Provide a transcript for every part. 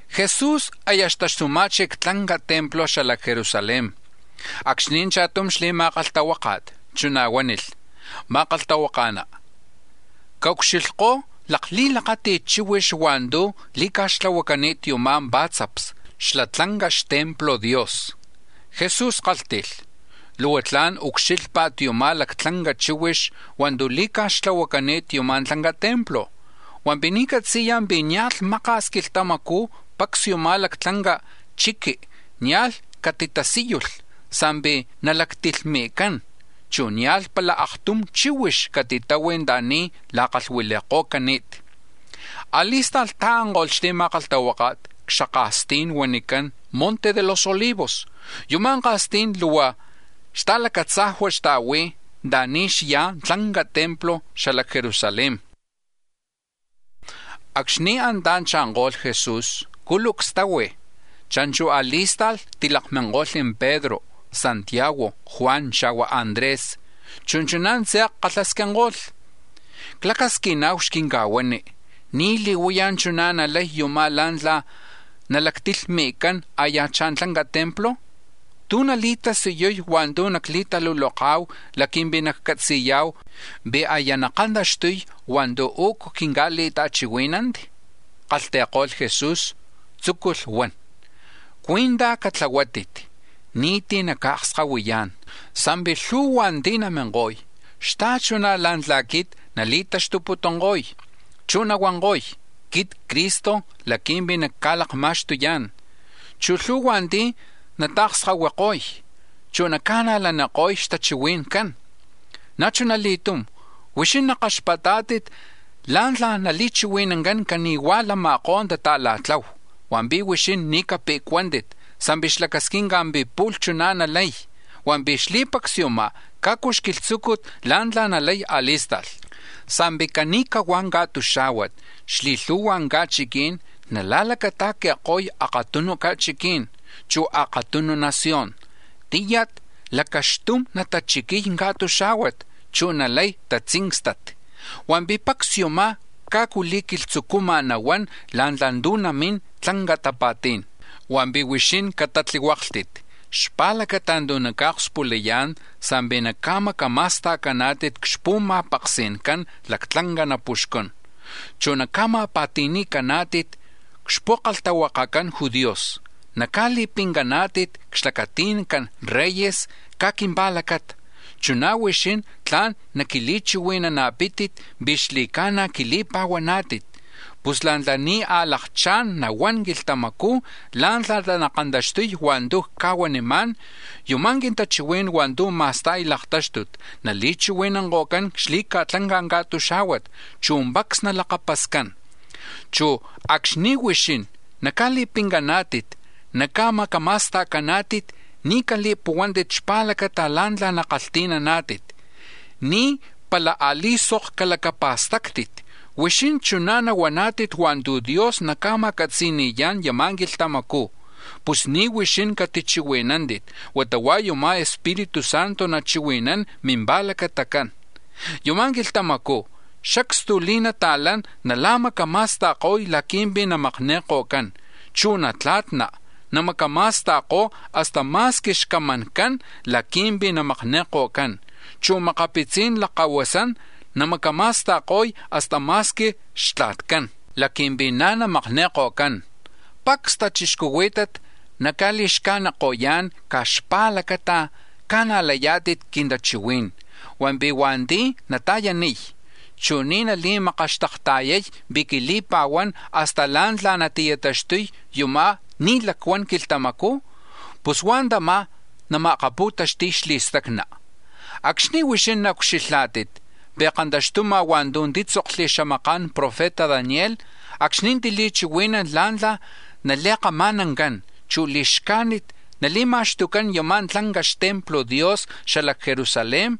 Jesús aya xtaxtuma̱chi̱ c-tlanca templo xala c-Jerusalén acxni̱ cha̱tum xli̱ma̱kalhtahuáka̱t, chuná̱ huánilh: —Ma̱kalhtahuaka̱ná, caucxilhkó̱ lakli̱lakati̱t chíhuix hua̱ntu̱ li̱ca̱xtlahuacani̱t yuma̱ pá̱tzaps xla tlanca xtemplo̱ Dios. Jesús kálhti̱lh: —Luhua tla̱n ucxílhpa̱t yuma̱ lactlanca chíhuix hua̱ntu̱ li̱ca̱xtlahuacani̱t yuma̱ tlanca templo, hua̱mpi̱ ni̱ catzi̱ya̱ pi̱ nia̱lh maka̱s quilhtamacú̱ pacs yuma̱ lactlanca chiqui nia̱lh catitasíyulh, sa̱mpi̱ nalactilhmi̱cán, chu̱ nia̱lh pala aktum chíhuix catitahui̱ anta̱ni̱ la̱kalhuili̱ko̱cani̱t. A̱li̱sta̱lh ta̱anko̱lh xli̱ma̱kalhtahuáka̱t c-xaka̱stí̱n huanicán Monte de los Olivos. Yuma̱ ka̱stí̱n luhua xta̱lacatzajua̱ xta̱hui̱ anta̱ni̱ xyá̱ tlanca templo xala c-Jerusalén. Acxni̱ antá̱ cha̱nko̱lh Jesús, cúlucs tahui̱. Cha̱nchu̱ a̱li̱sta̱lh tilakminko̱lh Pedro, Santiago, Juan, xa̱hua̱ Andrés, chu̱ chuná̱ tze̱k kalhasquinko̱lh: —Clacasquina̱hu xquinca̱huani, ¿ní̱ li̱huaya̱ chuná̱ nalay yumá̱ la̱ntla̱ nalactilhmi̱cán a̱ya̱chá̱ tlanca templo? ¿Tú̱ nali̱tasiyuy hua̱ntu̱ naclitaluloka̱hu laqui̱mpi̱ naccatzi̱ya̱hu pi̱ aya nakantaxtuy hua̱ntu̱ u̱cu quinca̱li̱ta̱chihuí̱nanti? Kalhti̱ko̱lh Jesús, tzúculh huan: “Cuí̱ntaj catlahuátit, ni̱tí̱ naca̱akskahuiyá̱n. Sa̱mpi̱ lhu̱hua̱ ti̱ naminko̱y xta̱chuná̱ la̱ntla̱ quit nali̱taxtuputunko̱y, chu̱ nahuanko̱y: ‘Quit Cristo laqui̱mpi̱ nacca̱lakma̱xtuyá̱n’, chu̱ lhu̱hua̱ ti̱ nata̱kskahuiko̱y, chu̱ naca̱najlaniko̱y xtachihui̱ncán. “Na̱ chuna li̱tum, huixín nakaxpatá̱tit la̱ntla̱ nali̱chihui̱nancán cani̱huá̱ lama̱kó̱ la̱ta̱la̱tlahu, hua̱mpi̱ huixín ni̱ cape̱cuántit sa̱mpi̱ xlacasquinca̱ pi̱ pu̱lh chuná̱ nalay. Hua̱mpi̱ xli̱pacs yumá̱ cajcu xquilhtzúcut la̱ntla̱ nalay á̱li̱sta̱lh. Sa̱mpi̱ cani̱cahuá̱ ca̱tuxá̱huat xli̱lhu̱hua ca̱chiquí̱n nala̱lacata̱qui̱ko̱y akatunu ca̱chiquí̱n, chu̱ akatunu nación. Tíyat lacaxtum natachiquiy ca̱tuxá̱huat, chu̱ nalay tatzíncstat. Hua̱mpi̱ pacs yumá̱ cajcu li̱quilhtzucúmaj nahuán la̱ntla̱ tu̱ namín tlanca tapa̱tí̱n. “Hua̱mpi̱ huixín catatlihuáklhtit xpa̱lacata̱ tu̱ naca̱okspulayá̱n sa̱mpi̱ naca̱macama̱sta̱caná̱tit c-xpu̱ma̱paksi̱ncan lactlanca napuxcún, chu̱ naca̱ma̱pa̱ti̱ni̱caná̱tit c-xpu̱kalhtahuakacan judíos, naca̱li̱pincaná̱tit c-xlacati̱ncan reyes caj quimpa̱lacata; chuná̱ huixín tla̱n naquili̱chihui̱nana̱pítit pi̱ xli̱ca̱na̱ quili̱pa̱huaná̱tit. Pus la̱ntla̱ ni̱ a̱lakchá̱n nahuán quilhtamacú̱ la̱ntla̱ nakantaxtuy hua̱ntu̱ cca̱huanimá̱n, yuma̱ quintachihuí̱n hua̱ntu̱ ma̱sta̱y laktáxtut nali̱chihui̱nanko̱cán xli̱ca̱tlanca̱ ca̱tuxá̱huat, chu̱ pacs nalakapascán. Chu̱ acxni̱ huixín naca̱li̱pincaná̱tit, naca̱macama̱sta̱caná̱tit, ni̱ cali̱puhuántit xpa̱lacata la̱ntla̱ nakalhti̱naná̱tit, ni̱ pala a̱li̱sok calacapa̱stáctit. Huixín chuná̱ nahuaná̱tit hua̱ntu̱ Dios naca̱ma̱catzi̱ni̱yá̱n yama̱ quilhtamacú̱, pus ni̱ huixín catichihui̱nántit huata hua̱ yama̱ Espíritu Santo nachihui̱nán mimpa̱lacatacán. Yama̱ quilhtamacú̱ xacstu li̱nata̱lán nala̱macama̱sta̱ko̱y laqui̱mpi̱ namakni̱ko̱cán, chu̱ natla̱tna̱ namacama̱sta̱ko̱y hasta ma̱squi xcamancán laqui̱mpi̱ namakni̱ko̱cán, chu̱ makapitzi̱n lakkahuasán namacama̱sta̱ko̱y hasta ma̱squi xtla̱tcán laqui̱mpi̱ na̱ namakni̱ko̱cán. Pacs tachixcuhuí̱tat naca̱li̱xcajniko̱yá̱n caj xpa̱lacata ca̱najlayá̱tit quintachihuí̱n, hua̱mpi̱ hua̱nti̱ nata̱yaniy, chu̱ ni̱ nali̱makaxtakta̱yay pi̱ quili̱pa̱huán hasta la̱ntla̱ nati̱taxtuko̱y yuma̱ ni̱ lacuan quilhtamacú̱, pus hua̱ tamá̱ nama̱akapu̱taxti̱y xli̱stacna. “Acxni̱ huixín naucxilhá̱tit pi̱ kantaxtuma̱ hua̱ntu̱ títzokli̱ xamaka̱n profeta Daniel acxni̱ tili̱chihuí̱nalh la̱ntla̱ nali̱kama̱nancán, chu̱ li̱xcájnit nali̱ma̱xtucán yama̱ tlanca xtemplo̱ Dios xala c-Jerusalén,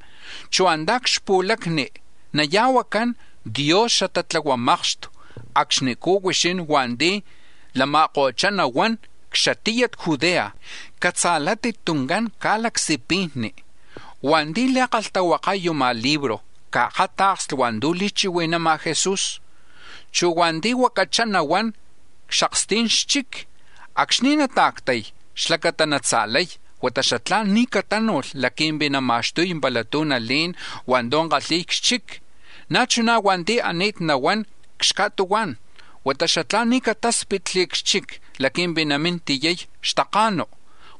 chu̱ antá̱ c-xpu̱lacni naya̱huacán dios xatatlahuamakxtu; acxnicú̱ huixín hua̱nti̱ lama̱ko̱chá nahuán c-xatiyat Judea catza̱látit tuncán ca̱lacsipijni. (Hua̱nti̱ li̱kalhtahuakay yuma̱ libro caakáta̱ksli̱ hua̱ntu̱ li̱chihui̱nama̱ Jesús.) Chu̱ hua̱nti̱ huacachá nahuán c-xaksti̱n xchic, acxni̱ nata̱ctay laqui̱mpi̱ natza̱lay, huata xatlá̱n ni̱ catánu̱lh laqui̱mpi̱ nama̱xtuy pala tu̱ nalé̱n hua̱ntu̱ kalhi̱y c-xchic. Na̱ chuná̱ hua̱nti̱ ani̱t nahuán c-xca̱tuhuá̱n, huata xatlá̱n ni̱ catáspitli̱ c-xchic laqui̱mpi̱ namín tiyay xtaka̱nu.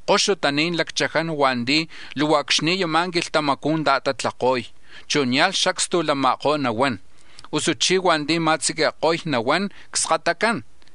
¡Koxutaní̱n lacchaján hua̱nti̱ luhua acxni̱ yama̱ quilhtamacú̱ ta̱tatlako̱y, chu̱ nia̱lh xacstu lama̱koj nahuán, usuchí̱ hua̱nti̱ ma̱tziqui̱ko̱y nahuán cskatacán!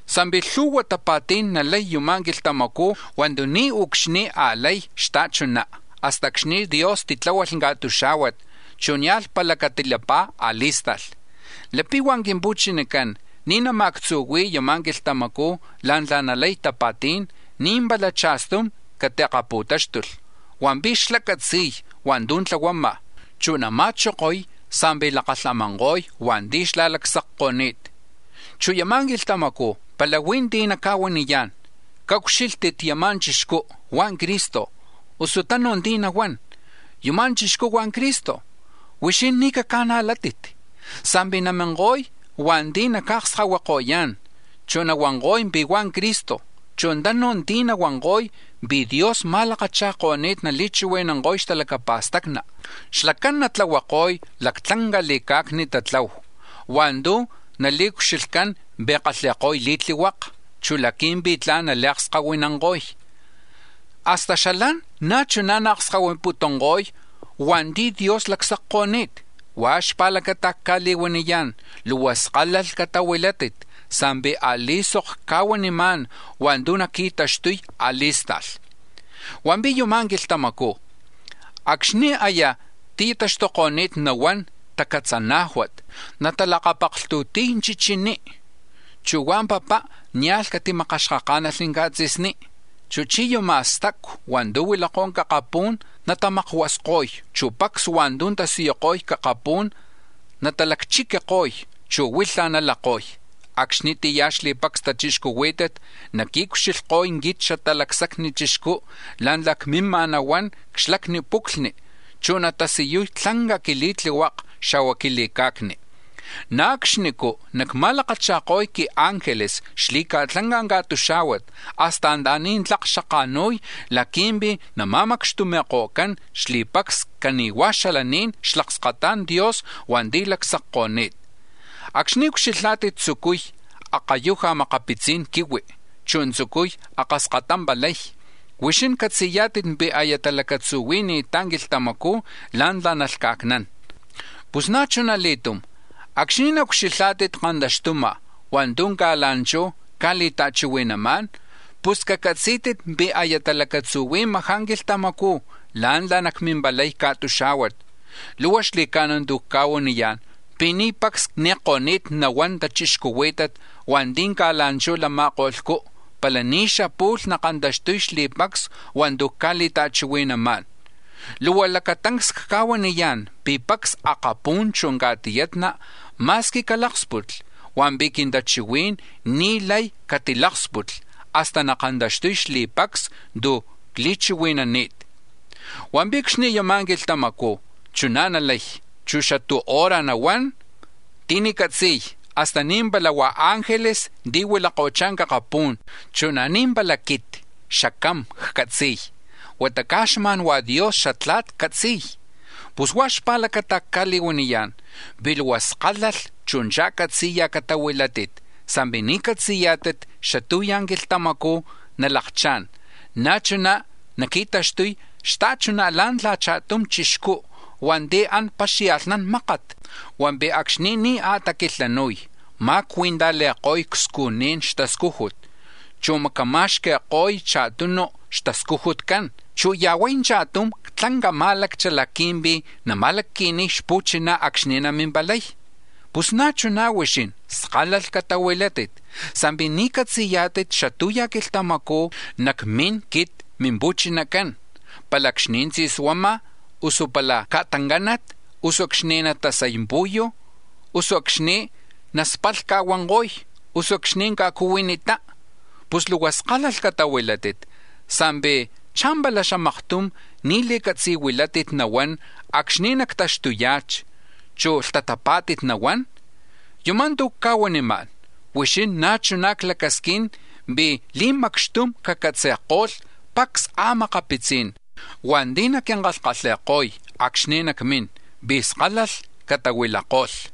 Sa̱mpi̱ lhu̱hua tapa̱tí̱n nalay yama̱ quilhtamacú̱ hua̱ntu̱ niucxni̱ a̱lay xta̱chuná̱ hasta acxni̱ Dios titláhualh ca̱tuxá̱huat, chu̱ nia̱lh pala catilapá̱ a̱li̱sta̱lh. Lapi̱ hua̱ quimpu̱chinacán ni̱ nama̱actzuhui̱y yama̱ quilhtamacú̱ la̱ntla̱ nalay tapa̱tí̱n, ni̱ pala cha̱stum catiakapu̱táxtulh, hua̱mpi̱ xlá̱ catzi̱y hua̱ntu̱ tlahuama̱, chu̱ nama̱chokoy sa̱mpi̱ lakalhamanko̱y hua̱nti̱ xlá̱ lacsacko̱ni̱t. “Chu̱ yama̱ quilhtamacú̱ pala huí̱ ti̱ naca̱huaniyá̱n: ‘Caucxílhtit yama̱ chixcú huá̱ Cristo’, usu tanu̱ ti̱ nahuán: ‘Yuma̱ chixcú hua̱ Cristo’, huixín ni̱ caca̱najlátit. Sa̱mpi̱ naminko̱y hua̱nti̱ naca̱akskahuiko̱yá̱n, chu̱ nahuanko̱y pi̱ huá̱ Cristo, chu̱ tanu̱ ti̱ nahuanko̱y pi̱ Dios ma̱lakacha̱ko̱ni̱t nali̱chihui̱nanko̱y xtalacapa̱stacni. Xlacán natlahuako̱y lactlanca li̱ca̱cni tatlahu hua̱ntu̱ nali̱ucxilhcán pi̱ kalhi̱ko̱y li̱tlihuaka, chu̱ laqui̱mpi̱ tla̱n nali̱akskahuinanko̱y; hasta xalán na̱ chuná̱ naakskahuiputunko̱y hua̱nti̱ Dios lacsacko̱ni̱t. Huá̱ xpa̱lacata cca̱li̱huaniyá̱n, luhua skálalh catahuilátit sa̱mpi̱ a̱li̱sok cca̱huanimá̱n hua̱ntu̱ naqui̱taxtuy a̱li̱sta̱lh. “Hua̱mpi̱ yama̱ quilhtamacú̱ acxni̱ aya ti̱taxtuko̱ni̱t nahuán tacatzanájuat, natalakapaklhtu̱ti̱y chichiní, chu̱ hua̱ papá, nia̱lh catimakaxkaká̱nalh ca̱tzi̱sní. Chuj chí̱ yama̱ stacu̱ hua̱ntu̱ huilakó̱ c-akapú̱n natamakuasko̱y, chu̱ pacs hua̱ntu̱ tasiyuko̱y c-akapú̱n natalacchiquiko̱y, chu̱ huilhaj nalako̱y. Acxnitiyá̱ xli̱pacs tachixcuhuí̱tat naquiucxilhko̱y quit Xatalacsacni Chixcú la̱ntla̱ cmímaj nahuán c-xlacni puclhni, chu̱ natasiyuy tlanca quili̱tlihuaka, xa̱hua̱ quili̱ca̱cni. Na̱ acxnicú̱ nacma̱lakacha̱ko̱y quiángeles xli̱ca̱tlanca̱ ca̱tuxá̱huat hasta anta̱ni̱ tlak xatanka̱nu̱y laqui̱mpi̱ nama̱macxtumi̱ko̱cán xli̱pacs cani̱hua̱ xalaní̱n xlakskata̱n Dios hua̱nti̱ lacsacko̱ni̱t. “Acxni̱ ucxilhá̱tit tzucuy akayuja̱ makapitzi̱n quihui, chu̱ tzucuy akaskatampalay, huixín catzi̱yá̱tit pi̱ aya talacatzuhui̱ni̱ttá̱ quilhtamacú̱ la̱ntla̱ nalhca̱cnán. Pus na̱ chuna li̱tum acxni̱ naucxilhá̱tit kantaxtuma̱ hua̱ntu̱ ca̱la̱nchú̱ cca̱li̱ta̱chihui̱namá̱n, pus cacatzí̱tit pi̱ aya talacatzuhui̱majá̱ quilhtamacú̱ la̱ntla̱ nacmimpalay ca̱tuxá̱huat. Luhua xli̱ca̱na̱ tu̱ cca̱huaniyá̱n pi̱ ni̱ pacs ni̱ko̱ni̱t nahuán tachixcuhuí̱tat hua̱nti̱ ca̱la̱nchú̱ lama̱ko̱lhcú̱ pala ni̱ xapu̱lh nakantaxtuy xli̱pacs hua̱ntu̱ cca̱li̱ta̱chihui̱namá̱n. Luhua lacatancs cca̱huaniyá̱n pi̱ pacs akapú̱n chu̱ ca̱tiyatna̱ ma̱squi caláksputli, hua̱mpi̱ quintachihuí̱n ni̱ lay catiláksputli̱ hasta nakantaxtuko̱y xli̱pacs tu̱ cli̱chihui̱nani̱t. “Hua̱mpi̱ acxni̱ yama̱ quilhtamacú̱ chuná̱ nalay, chu̱ xatú̱ hora nahuán, ti̱ni̱ catzi̱y, hasta ni̱ pala hua̱ ángeles ti̱ huilako̱chá̱ c-akapú̱n, chu̱ na̱ ni̱ pala quit Xacam ccatzi̱y, huata caj xma̱n Dios Xatla̱t catzi̱y. “Pus huá̱ xpa̱lacata̱ cca̱li̱huaniyá̱n pi̱ luhua skálalh, chu̱ cha̱catzi̱ya̱ catahuilátit sa̱mpi̱ ni̱ catzi̱yá̱tit xatú̱ ya̱ quilhtamacú̱ nalakchá̱n. Na̱ chuná̱ naqui̱taxtuy xta̱chuná̱ la̱ntla̱ cha̱tum chixcú hua̱nti̱ an paxia̱lhnán mákat, hua̱mpi̱ acxni̱ ni̱ a̱taquilhanu̱y, ma̱cui̱ntajli̱ko̱y cscujní̱n xtascújut, chu̱ macama̱xqui̱ko̱y cha̱tunu̱ xtascujutcán, chu̱ ya̱huay cha̱tum c-tlanca má̱laccha laqui̱mpi̱ nama̱lacqui̱niy xpu̱chiná̱ acxni̱ namimpalay. Pus na̱ chuná̱ huixín skálalh catahuilátit sa̱mpi̱ ni̱ catzi̱yá̱tit xatú̱ ya̱ quilhtamacú̱ nacmín quit Mimpu̱chinacán, pala acxni̱ tzi̱suama̱, usu pala ca̱ta̱ncánat, usu acxni̱ natasay pu̱yu̱, usu acxni̱ naspalhca̱huanko̱y, usu acxni̱ ca̱cuhuinitá. Pus luhua skálalh catahuilátit sa̱mpi̱, ¿cha̱mpala xamaktum ni̱ li̱catzi̱huilátit nahuán acxni̱ nactaxtuya̱chi, chu̱ lhtatapá̱tit nahuán? Yuma̱ tu̱ cca̱huanimá̱n huixín na̱ chuná̱ clacasquín pi̱ li̱macxtum cacatzi̱ko̱lh pacs a̱makapitzí̱n hua̱nti̱ naquinkalhkalhi̱ko̱y acxni̱ nacmín, pi̱ skálalh catahuilako̱lh.”